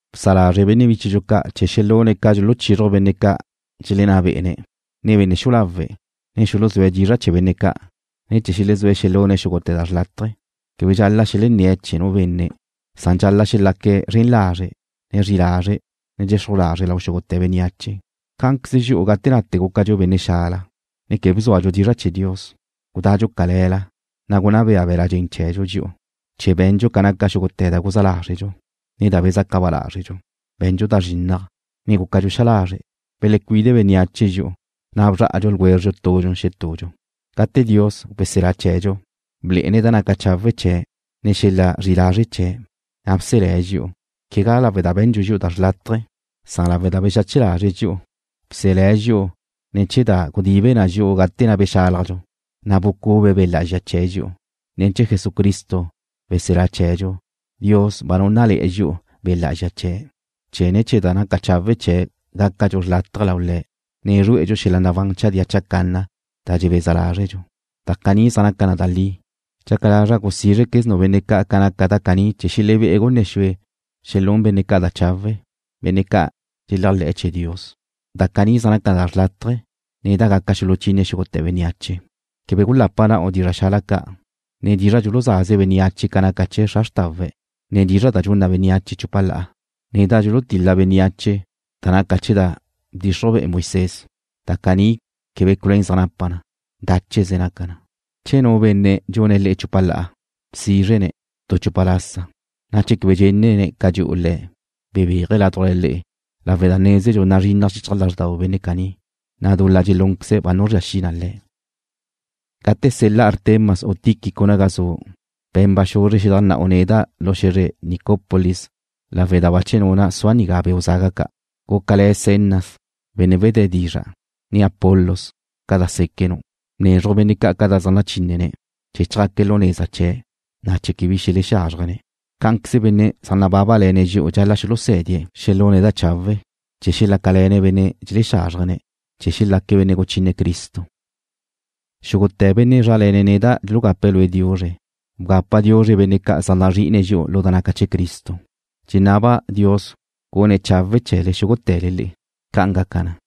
Bsa lazre' benne' bíchedxu ca' chee̱ xelune̱' ca dxuluchixruj benne' ca' dxelenná bé'ene̱', ne benne' xu'u lawe', ne chee̱ xuluzúe̱' dizra' chee̱ benne' ca', ne chee̱ xelezúe̱' xelune̱' xúgute̱ da xrlátaje. Quebe dxal-la' xelenné̱ chee̱ nu benne', san dxal-la' xelaque̱' zren lazre', ne zri'i lazre', ne dxexruj lazre' lau xúgute̱ bénneache. Cá'anqueze dxi'u gate nate gúcadxu benne' xala, ne quebe bzúadxu dizra' chee̱ Dios. Gudadxu cale̱la, na' gunná be'e be̱la' dxen chee̱dxu dxi'u, chee̱ be̱ndxu ca naca xúgute̱ da guzá lázredxu, ne da bezaca ba lázredxu. Be̱ndxu da zrinnaj, ne gúcadxu xa lazre'. Belecuide bénneache dxi'u, na' bzrá'adxu ljwézredxu tudxu xetudxu. Gate Dios, weselá chee̱dxu, blé'ene̱' da naca chawe' chee̱', ne xel-la zri'i lazre' chee̱', na' bselé̱' dxi'u, quegá lawe' da be̱ndxu dxi'u tu da xrlátaje, san lawe' da bexache lazre̱' dxi'u. Bselé̱' dxi'u ne̱ chee̱ da gudibe na dxi'u gate na' bexálajdxu, na' bucube Be' Lá'azxa chee̱' dxi'u. Ne̱ chee̱ Jesucristo, weselá chee̱dxu, Dios ba núnnale̱'e̱ dxi'u Be' Lá'azxa chee̱', chee̱ ne̱ chee̱ da naca chawe' chee̱' gácadxu xrlátaje lau Le̱', ne zrué'edxu xel-la nabán chadía chacanna da dxebeza lázredxu. Da caní zaj naca na da li. Dxaca lazra' gusízrequeznu' benne' ca' ca naca da caní chee̱ xelebé' gunne xue xelún benne' ca' da chawe', benne' ca' dxeléajle̱'e̱ chee̱ Dios. Da caní zaj naca na da xrlátaje, ne da gaca xuluchine xúgute̱ bénneache. Quebe gulapa na'u dizra' xala ca', ne dizra' dxuluzaze bénneache ca naca chee̱ zra xrtawe̱', ne dizra' da dxun na bénneache chupa la'a, ne da dxulutil-la bénneache da naca chee̱ da bchixruj be'e Moisés. Da caní quebe culuén zaj napa na. Dácheze naca na. Che nu benne' dxune̱' le'e chupa la'a, bsizre-ne̱' tu chupa lasa, ne che quebe dxenne̱' ca dxu'u le̱', bebéaje̱' ládujla le'e lawe' da nézenu' nazrinnaj xichaj lázxdau benne' caní, na' dul-la dxelúnqueze̱' ba nuzría xi na le̱'. Gate sel-la' Artemas u Tíquico naga zu', be̱n baxuzre xidu' xedajnna'u neda' lu xe̱zre Nicopolis lawe' da bache nuna' sua' nigá beu' zaga ca'. Gúcale̱ Zenas, benne' wedé dizra', ne Apolos, ca da séquenu'. Bnezruj benne' ca' ca da zaj nachínene̱' chee̱ chjaque̱' lu neza chee̱', na' quebe bi xelexázrjene̱'. Cá'anqueze benne' zaj nabábale̱ne̱' dxi'u dxal-la' xulusé̱die̱' xelune̱' da chawe', chee̱ xelácale̱ne̱' benne' dxelexázrjene̱', chee̱ xelaque̱' benne' guchine Cristo. Xúgute̱ benne' zrále̱ne̱' neda' dxulugape̱' lue' diuzre. Bgape diuzre benne' ca' zaj nazrí'ine̱' dxi'u lu da naca chee̱ Cristo. Dxenaba' Dios gun chawe̱'e̱ xúgute̱le le'e. ¡Ca'an gaca na!